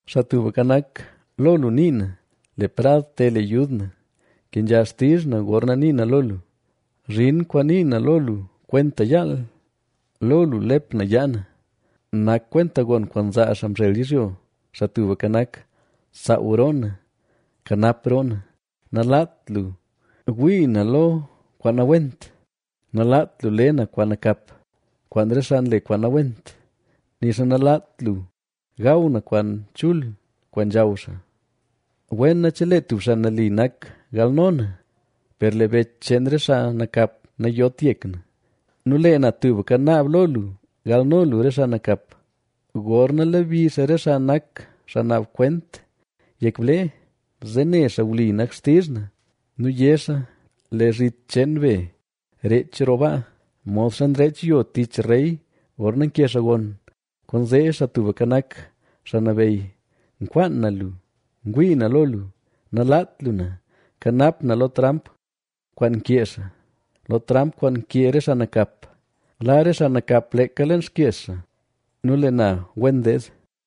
Xaa Tubka Nak, lo lu nii na; le prad te le yud na, kenzha xtizh na, gorna nii na lo lu. Zhin kwaan nii na lo lu kwenta yaal, lo lu lep na yaa na, nak kwenta gon kwaan nzaa xaa mzhel yizhyo. Xaa Tubka Nak, saaw roo na; kanap roo na. Nalaat lu gwii na lo kwaan nawent, nalaat lu le na kwaan nakap, kwaan re xaa nle kwaan nawent, nixa nalaat lu gaw na kwaan chul kwaan nzhaw xaa. Wena chelee tub xaa nali nak galno na; per lee bech cheen re xaa nakap nayot yek na nu lee na tubka naab lo lu galno lu re xaa nakap. Gorna lebi xaa re xaa nak xaa naab kwent yek blee, zee ne xaa wli nak xtizh na. Nu yé xaa: “Lee zhit cheen be reech roo baa, modxa nreech yo tich rey gorna nke xaa gon.” Kwaanzee Xaa Tubka Nak, xaa Nabeyy, nkwaan na lu; ngwii na lo lu. ¡Nalaat lu na! Kanap na lo tramp kwaan nkee xaa, lo tramp kwaan nkee re xaa nakap. Laa la re xaa nakap leeka leen xkyex xaa nu lee na wen deed.